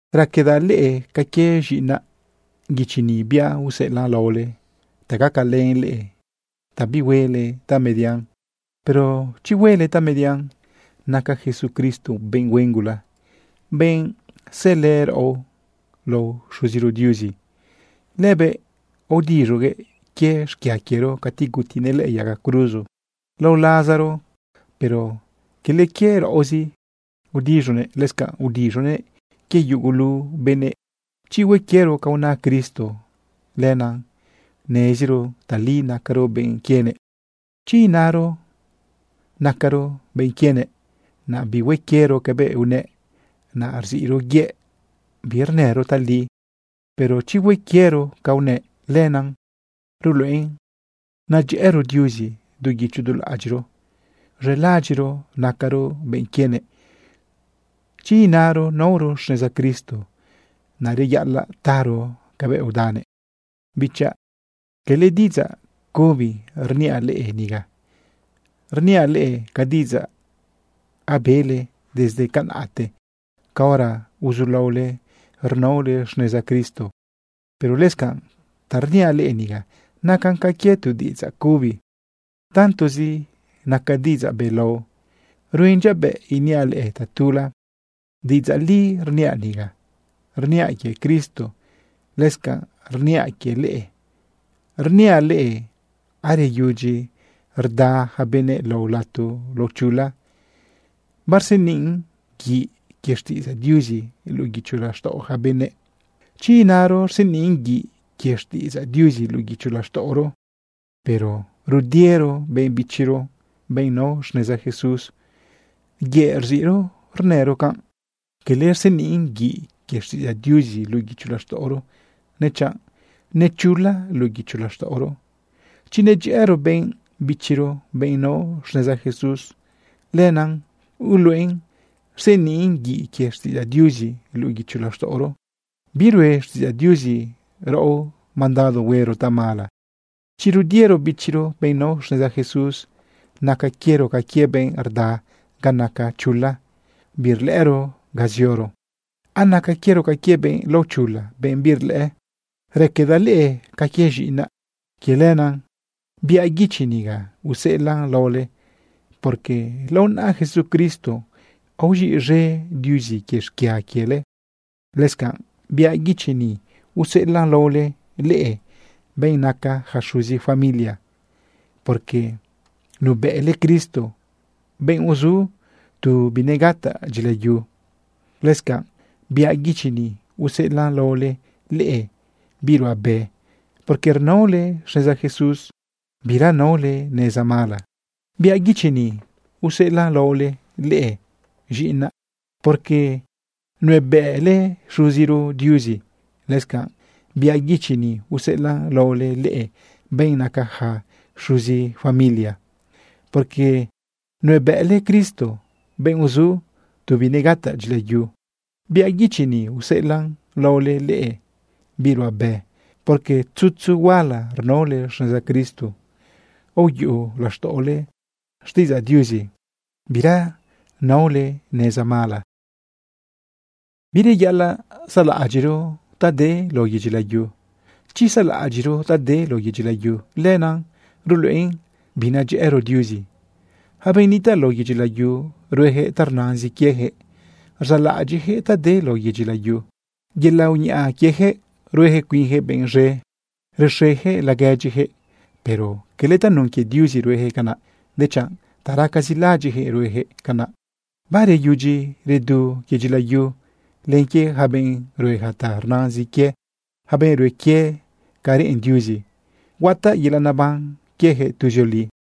Raquedaꞌ leꞌe ca quie z̃iꞌinaꞌ. Guichi ni biaꞌ useꞌelaꞌn laole ta gacalën leꞌe ta bihuele tamedian. Pero chi huele tamedian, naca Jesucristo benꞌ huen gula, benꞌ sëlë raꞌo lao Xuziro Diuzi. Lëbëꞌ aodiz̃uguëꞌ quie xquia quiero cati gutinëꞌ lëꞌë yaga cruzo lao lazaro. Pero quele quie raꞌozi udiz̃unëꞌ, lëscanꞌ udiz̃unëꞌ quie yugulu benëꞌ. Chi hue quiero ca una Cristo, lenaꞌ neziro tali nacaro benꞌ quienëꞌ. Chi inaro nacaro benꞌ quienëꞌ, naꞌ bihue quiero cabëꞌ unëꞌ, naꞌ rziꞌro yëꞌ, birnëro tali. Pero chi hue quiero ca unëꞌ, lenaꞌ rluꞌen nedyëꞌëro Diuzi du guicho du laꞌadyiꞌro, xelaꞌadyiꞌro nacaro benꞌ quienëꞌ. Chi inaro naoro xneza Cristo, naꞌ reyaꞌalaꞌ taro cabëꞌ udanëꞌ. Bichaꞌ, quele diꞌidzaꞌ cubi rniaꞌ leꞌe niga. Rniaꞌ leꞌe ca diꞌidzaꞌ abele desde canaꞌte caora uzulaole rnaole xneza Cristo. Pero lëscanꞌ ta rniaꞌ leꞌe niga, nacan ca quie tu diꞌidzaꞌ cubi. Tantozi naca diꞌidzaꞌ belao, ruen dyabëꞌ iniaꞌ leꞌe tatula. Diꞌidzaꞌ li rniaꞌ niga. Rniaꞌ quie Cristo, lëscanꞌ rniaꞌ quie leꞌe. Rniaꞌ leꞌe areyudyi rda yaca benëꞌ lao lato lao chula. Barseniꞌn guiꞌ quie xtiꞌidzaꞌ Diuzi luꞌu guicho laxtaꞌo yaca benëꞌ. Chi inaro rseniꞌn guiꞌ quie xtiꞌidzaꞌ Diuzi luꞌu guicho laxtaꞌoro, pero rudiero benꞌ bichiro, benꞌ nao xneza Jesús, yëꞌ rziꞌro rnëro canꞌ. Quele rseniꞌn guiꞌ quie xtiꞌidzaꞌ Diuzi luꞌu guicho laxtaꞌoro, nechanꞌ nechula luꞌu guicho laxtaꞌoro. Chi nedyëꞌëro benꞌ bichiro, benꞌ nao xneza Jesús, lenaꞌ uluꞌen rseniꞌn guiꞌ quie xtiꞌidzaꞌ Diuzi luꞌu guicho laxtaꞌoro. Birue xtiꞌidzaꞌ Diuzi raꞌo mandado huero tamala. Chi rudiero bichiro benꞌ nao xneza Jesús, naca quiero ca quie benꞌ rda ga naca chula, birlëꞌëro ga zioro. Anaca quiero ca quie benꞌ laochula, benꞌ birlëꞌë. Raquedaꞌ leꞌe ca quie z̃iꞌinaꞌ. Quie lenaꞌ biaꞌ guichi niga useꞌelaꞌn laole, porque lao naꞌa Jesucristo aoz̃iꞌz̃e Diuzi quie xquia quiele. Lëscanꞌ biaꞌ guichi ni, useꞌelaꞌn laole leꞌe, benꞌ naca ja xuzi familia, porque nuebëꞌle Cristo, benꞌ uzu tu binegataꞌ dyilayu. Lëscanꞌ biaꞌ guichi ni, useꞌelaꞌn laole leꞌe biꞌ ruꞌabe, porque rnaole xneza Jesús, bira naole neza mala. Biaꞌ guichi ni, useꞌelaꞌn laole leꞌe, z̃iꞌinaꞌ, porque nuebëꞌle Xuziro Diuzi. Lëscanꞌ biaꞌ guichi ni useꞌelaꞌn laole leꞌe, benꞌ naca ja xuzi familia, porque nuebëꞌle Cristo, benꞌ uzu tu binegataꞌ dyila yu. Biaꞌ guichi ni, useꞌelaꞌn laole leꞌe, biꞌ ruꞌabe, porque tzutzu huala rnaole xneza Cristo, aoyuꞌu laxtaꞌole xtiꞌidzaꞌ Diuzi, bira naole neza mala. Bireyaꞌalaꞌ saꞌlaꞌadyiꞌro ta de lao yedyi layu. Chi saꞌlaꞌadyiꞌro ta de lao yedyi layu, lenaꞌ ruluꞌen binadyëꞌëro Diuzi. Yaca benꞌ nitaꞌ lao yedyi layu, ruejëꞌ ta rnazin quiejëꞌ, rzaꞌlaꞌadyiꞌjëꞌ ta de lao yedyi layu. Yelaꞌ uñaꞌa quiejëꞌ, ruejëꞌ cuinjëꞌ benꞌ z̃e, rez̃ëꞌyaquëꞌ laguedyiyaquëꞌ. Pero quele tanun quie Diuzi ruejëꞌ canaꞌ, dechanꞌ ta racazi laꞌadyiꞌjëꞌ ruejëꞌ canaꞌ. Bareyudyi redu quie dyilayu len quie yaca benꞌ rueja ta rnazin quie. Yaca benꞌ rue quie ca reꞌen Diuzi, huataꞌ yelaꞌ neban quiejëꞌ tuzioli.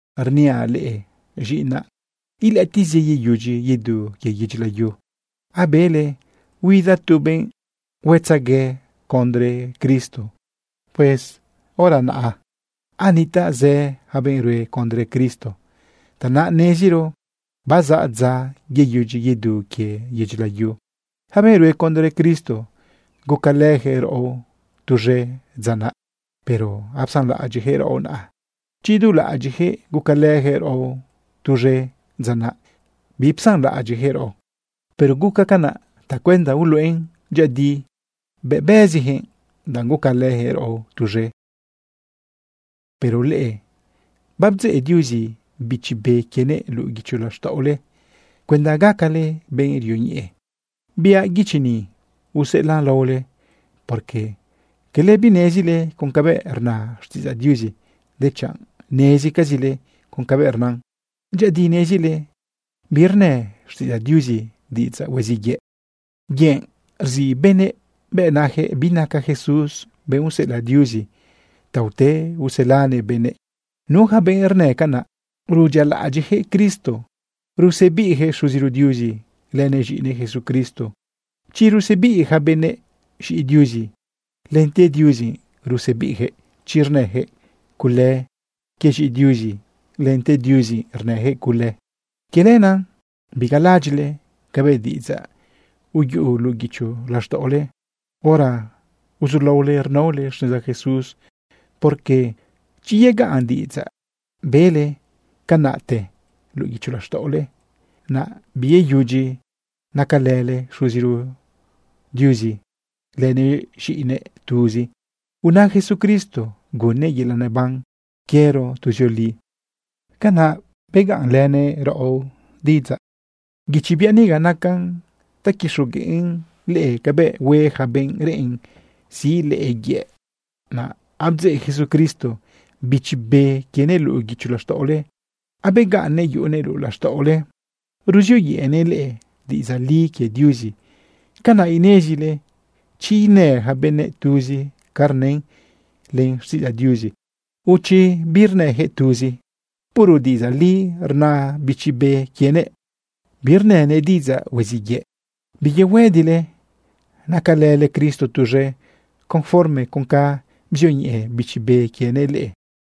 Rniaꞌ leꞌe, z̃iꞌinaꞌ, ilëꞌëtiꞌzi yeyudyi yedu quie yedyi layu. Abele huida tu benꞌ huetzague condre Cristo. Pues hora naꞌa anitaꞌ zë yaca benꞌ rue condre Cristo. Tanaꞌ neziro bazaꞌ dza yeyudyi yedu quie yedyi layu. Yaca benꞌ rue condre Cristo, gucalëjëꞌ raꞌo tuz̃e dza naꞌ, pero apsanlaꞌadyiꞌjëꞌ raꞌo naꞌa. Chi dulaꞌadyiꞌjëꞌ gucalëjëꞌ raꞌo tuz̃e dza naꞌ, bipsanlaꞌadyiꞌjëꞌ raꞌo. Pero guca canaꞌ tacuenda uluꞌen dyëꞌëdi bëꞌ bëziyaquëꞌ, danꞌ gucalëjëꞌ raꞌo tuz̃e. Pero leꞌe, babdzeꞌ Diuzi Bichi Be quienëꞌ luꞌu guicho laxtaꞌole cuenda gacale benꞌ rioñeꞌe. Biaꞌ guichi ni useꞌelaꞌn laole, porque quele binezile con cabëꞌ rna xtiꞌidzaꞌ Diuzi, dechanꞌ nezicazile con cabëꞌ rnan. Dyëꞌëdi nezile birnë xtiꞌidzaꞌ Diuzi diꞌidzaꞌ huiziꞌ yëꞌ. Yëꞌ rziꞌ benëꞌ bëꞌ nayaquëꞌ binaca Jesús benꞌ useꞌelaꞌ Diuzi ta ute uselanëꞌ benëꞌ. Nu yaca benꞌ rnë canaꞌ, rudyialaꞌadyiꞌyaquëꞌ Cristo. Rusebiꞌyaquëꞌ Xuziro Diuzi lënëꞌ z̃iꞌinëꞌ Jesucristo. Chi rusebiꞌ yaca benëꞌ z̃iꞌi Diuzi, lente Diuzi rusebiꞌyaquëꞌ. Chi rnëyaquëꞌ cule quie z̃iꞌi Diuzi, lente Diuzi rnëyaquëꞌ cule. Quie lenaꞌ bigalaꞌadyiꞌle cabëꞌ diꞌidzaꞌ uyuꞌu luꞌu guicho laxtaꞌole hora uzulaole rnaole xneza Jesús. Porque chi yegaꞌn diꞌidzaꞌ bele canaꞌte luꞌu guicho laxtaꞌole, naꞌ biyeyudyi nacalële Xuziro Diuzi lënëꞌ z̃iꞌinëꞌ tuzi. Una Jesucristo gunnëꞌ yelaꞌ neban quiero tuzioli. Canaꞌ begaꞌnlënëꞌ raꞌo diꞌidzaꞌ. Guichi biaꞌ niga, nacan ta quixogueꞌn leꞌe cabëꞌ hue yaca benꞌ reꞌen siꞌ leꞌe yëꞌ. Naꞌ abdzeꞌ Jesucristo Bichi Be quienëꞌ luꞌu guicho laxtaꞌole. Abegaꞌnnëꞌ yuꞌunëꞌ luꞌu laxtaꞌole ruzioñeꞌenëꞌ leꞌe diꞌidzaꞌ li quie Diuzi. Canaꞌ inezile chi inë yaca benëꞌ tuzi ca rnën len xtiꞌidzaꞌ Diuzi, o chi birnëyaquëꞌ tuzi. Puro diꞌidzaꞌ li rna Bichi Be quienëꞌ, birnënëꞌ diꞌidzaꞌ hueziꞌ yëꞌ. Biyehuëdile nacalële Cristo tuz̃e conforme con ca bzioñeꞌe Bichi Be quienëꞌ leꞌe.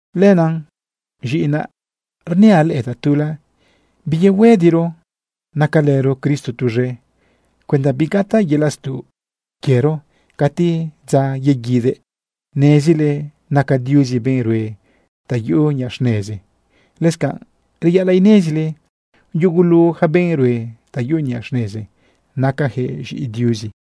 Lenaꞌ, z̃iꞌinaꞌ, rniaꞌ leꞌe tatula, biyehuëdiro nacalëro Cristo tuz̃e cuenda bigataꞌ yelaꞌ stuꞌ quiero cati dza yeguidëꞌ. Nezile naca Diuzi benꞌ rue ta yuꞌu niꞌa xnezi. Lëscanꞌ reyaꞌalaꞌ inezile yugulu yaca benꞌ rue ta yuꞌu niꞌa xnezi, nacayaquëꞌ z̃iꞌi Diuzi.